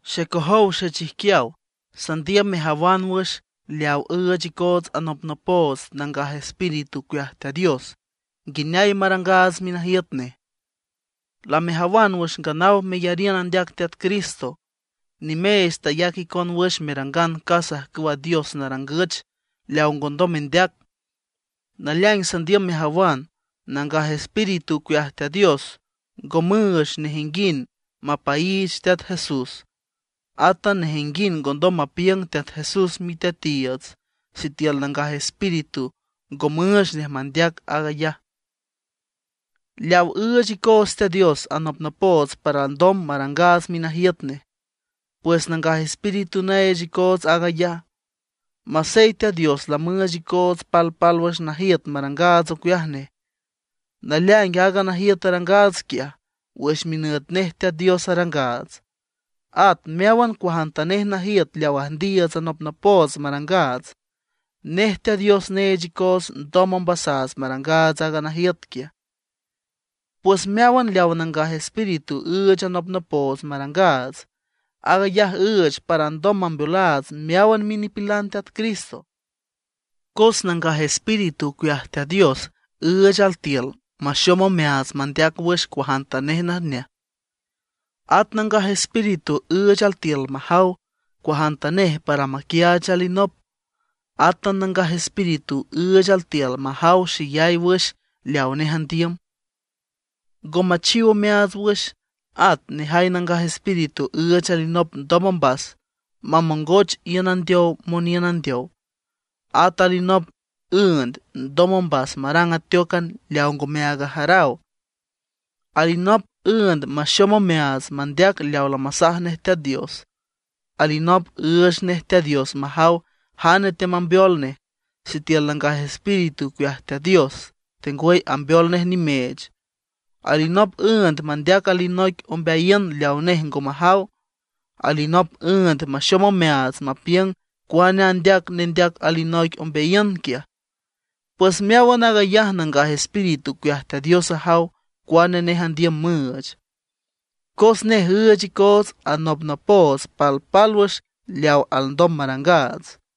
Xecojow xechijquiaw, sandiüm mejawan wüx leaw üüch icoots anopnopoots Nangaj Espíritu ocueaj Teat Dios nguineay marangaats minajiüt nej. Lamejawan wüx nganaw meyariün andeac Teat Cristo, nimeech tayac icon wüx merangan casa ajcüwa dios narangüch leaw ngondom mendeac. Naleaing sandiüm mejawan: Nangaj Espíritu ocueaj Teat Dios ngo müüch nejinguind mapaiich Teat Jesús. Átan nejinguind ngondom mapiüng Teat Jesús miteatiiüts, sitiül Nangaj Espíritu ngo müüch nej mandeac aag ayaj. Leaw üüch icoots Teat Dios anopnopoots para alndom marangaats minajiüt nej, pues Nangaj Espíritu neech icoots aag ayaj. Masey Teat Dios lamüüch icoots palpálwüx najiüt marangaats ocueaj nej, naleaing aaga najiüt arangaats quiaj, wüx minüt nej Teat Dios arangaats. At meáwan cuajantanej najiüt leaw üjndiiüts anopnopoots marangaats, nej Teat Dios neech icoots ndom ombasaats marangaats aaga najiüt quiaj. Pues meáwan leaw Nangaj Espíritu üüch anopnopoots marangaats, aag ayaj üüch para alndom mambeolaats meáwan minipilan Teat Cristo. Cos Nangaj Espíritu ocueaj Teat Dios üüch altiül maxom omeaats mandeac wüx cuajantanej najneaj. At Nangaj Espíritu üüch altiül majaw cuajantanej para maquiaach alinop. Átan Nangaj Espíritu üüch altiül majaw xeyay wüx leawa nej andiüm, ngo machiw omeaats wüx. At nejay Nangaj Espíritu üüch alinop ndom ombas mamongoch iün andeow moniün andeow. At alinop üünd ndom ombas marang ateócan leaw ngomeaag ajaraw. Alinop üünd maxom omeaats mandeac leaw lamasaj nej Teat Dios. Alinop üüch nej Teat Dios majaw jane teamambeol nej, sitiül Nangaj Espíritu ocueaj Teat Dios, tengwüy ambeol nej nimeech. Alinop üünd mandeac alinoic ombeayiün leaw nej ngo majaw; alinop üünd maxom omeaats mapiüng cuane andeac aaga nendeac alinoic ombeayiün quiaj. Pues meáwan aag ayaj Nangaj Espíritu ocueaj Teat Dios ajaw cuane nej andiüm müüch, cos nej üüch icoots anopnopoots palpálwüx leaw alndom marangaats.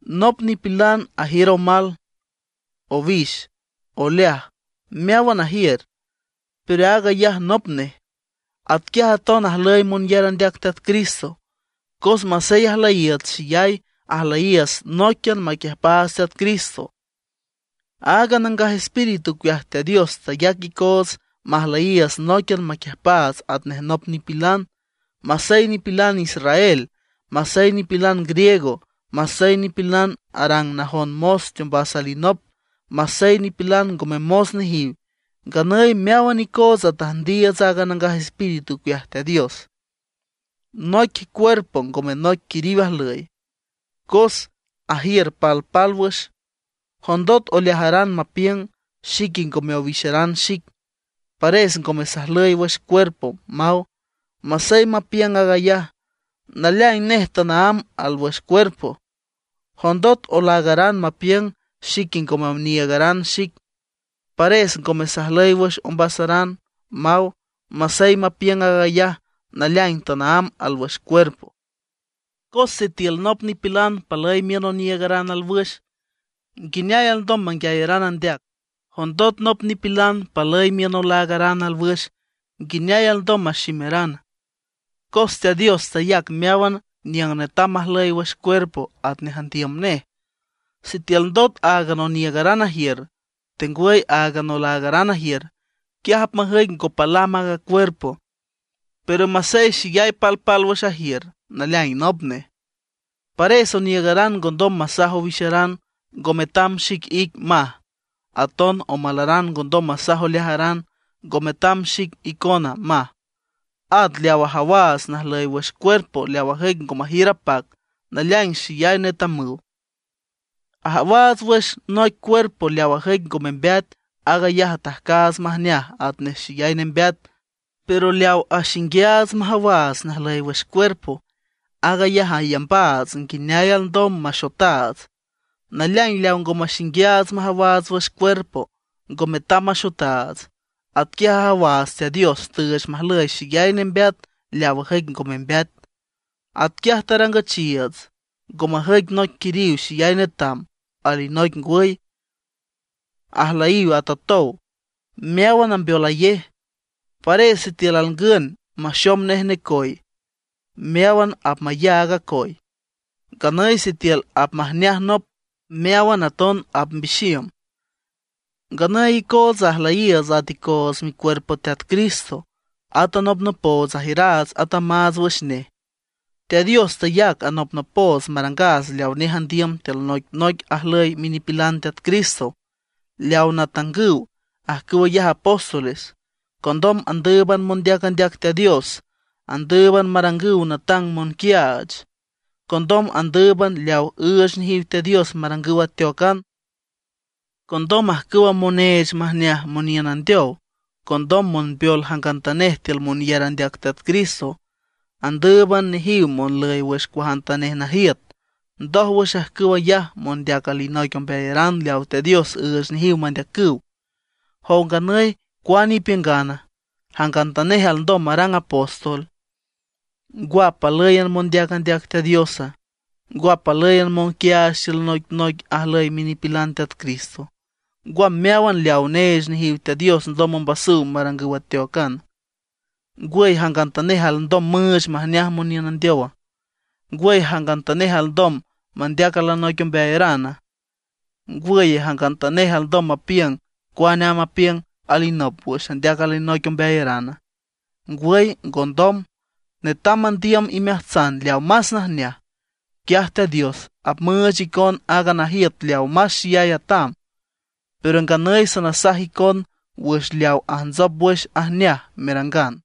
Nop nipilan ajiür omal, owix, oleaj, meáwan ajiür, pero aag ayaj nop nej. Atquiaj aton ajlüy monyar andeac Teat Cristo. Cos masey ajlüyiiüts xeyay, ajlüyiiüts nóiquian maquiüjpaats Teat Cristo. Aaga Nangaj Espíritu ocueaj Teat Dios tayac icoots majlüyiiüts nóiquian maquiüjpaats atnej nop nipilan, masey nipilan israel, masey nipilan griego; masey nipilan arang najon mos teombas alinop, masey nipilan ngome mos nejiw. Nganüy meáwan icootsa tüjndiiüts aaga Nangaj Espíritu ocueaj Teat Dios. Noic cuerpo ngome noic quiriw ajlüy, cos ajiür palpálwüx. Jondot oleajaran mapiüng: “Xique ngome owixaran xic, pares ngome sajlüy wüx cuerpo”, maw. Masey mapiüng ayaj, naleaing nej tanaámb alwüx cuerpo. Jondot olaagaran mapiüng: “Xique ngome oniiügaran xic, pares ngome sajlüy wüx ombasaran”, maw. Masey mapiüng aag ayaj, naleaing tanaámb alwüx cuerpo. Cos sitiül nop nipilan palüy miün oniiügaran alwüx, ¿nguineay alndom manguiayarana? Jondot nop nipilan palüy miün olaagaran alwüx, ¿nguineay alndom maximarana? Cos Teat Dios tayac meáwan niüng netam majlüy wüx cuerpo atnej andiüm nej. Sitiül ndot áagan oniiügaran ajiür, tengwüy áagan olaagaran ajiür, quiaj apmajüic ngo palam aaga cuerpo. Pero masey xeyay palpálwüx ajiür, naleaing nop nej. Pares oniiügaran ngondom masaj owixaran: “Ngo metam xic ic”, maj. Aton omalaran ngondom masaj oleajaran: “Ngo metam xic icona”, maj. At leaw ajawaats najlüy wüx cuerpo leaw ajüic ngo majiür apac, naleaing xeyay netamüw. Ajawaats wüx noic cuerpo leaw ajüic ngo membeat, aag ayaj atajcaats majneaj atnej xeyay nembeat. Pero leaw axinguiaats majawaats najlüy wüx cuerpo, aag ayaj ayambaats nguineay alndom maxotaats. Naleaing leaw ngo maxinguiaats majawaats wüx cuerpo, ngo metam maxotaats. Atquiaj ajawaats Teat Dios tüüch majlüy xeyay nembeat leaw ajüic ngo membeat. Atquiaj tarangüchiiüts, ngo majüic noic quiriw xeyay netam, alinoic ngwüy, ajlüyiw atotow, meáwan ambeolayej. Pares sitiül alngün maxom nej necoy, meáwan apmayaag acoy. Nganüy sitiül apmajneaj nop, meáwan aton apmbixiüm. Nganüy icootsa ajlüyiiüts at icoots micuerpo Teat Cristo; at anopnopoots ajiüraats atamaats wüx nej. Teat Dios tayac anopnopoots marangaats leawa nej andiüm tiül noicnoic ajlüy minipilan Teat Cristo. Leaw natangüw, ajcüw ayaj apóstoles. Condom andǘüban mondeac andeac Teat Dios. Andǘüban marangüw natang monquiaach. Condom andǘüban leaw üüch nejiw Teat Dios marangüw ateócan. Condom ajcüw moneech majneaj moniün andeow. Condom monbeol jangantanej tiül monyar andeac Teat Cristo. Andǘüban nejiw monlüy wüx cuajantanej najiüt. Ndójwüx ajcüw ayaj mondeac alinoic ombeayaran leaw Teat Dios üüch nejiw mandeacüw. ¿Jow nganüy cuane ipiüngana, jangantanej alndom marang apóstol? ¿Ngwa, palǘyan mondeac andeac Teat Diosa? ¿Ngwa, palǘyan monquiaach tiül noicnoic ajlüy minipilan Teat Cristo? ¿Ngwa, meáwan leawa neech nejiw Teat Dios ndom ombasüw marangüw ateócana? ¿Ngwüye, jangantanej alndom müüch majneaj moniün andeowa? ¿Ngwüye, jangantanej alndom mandeac alinoic ombeayarana? ¿Ngwüye, jangantanej alndom mapiüng cuane amb apiüng alinop wüx andeac alinoic ombeayarana? ¡Ngwüy ngondom! Netam mandiüm imeajtsan leawa más najneaj, quiaj Teat Dios apmüüch icon aaga najiüt leawa más xeyay atam. Pero nganüy sanasaj icon wüx leaw ajntsop wüx ajneaj merangan.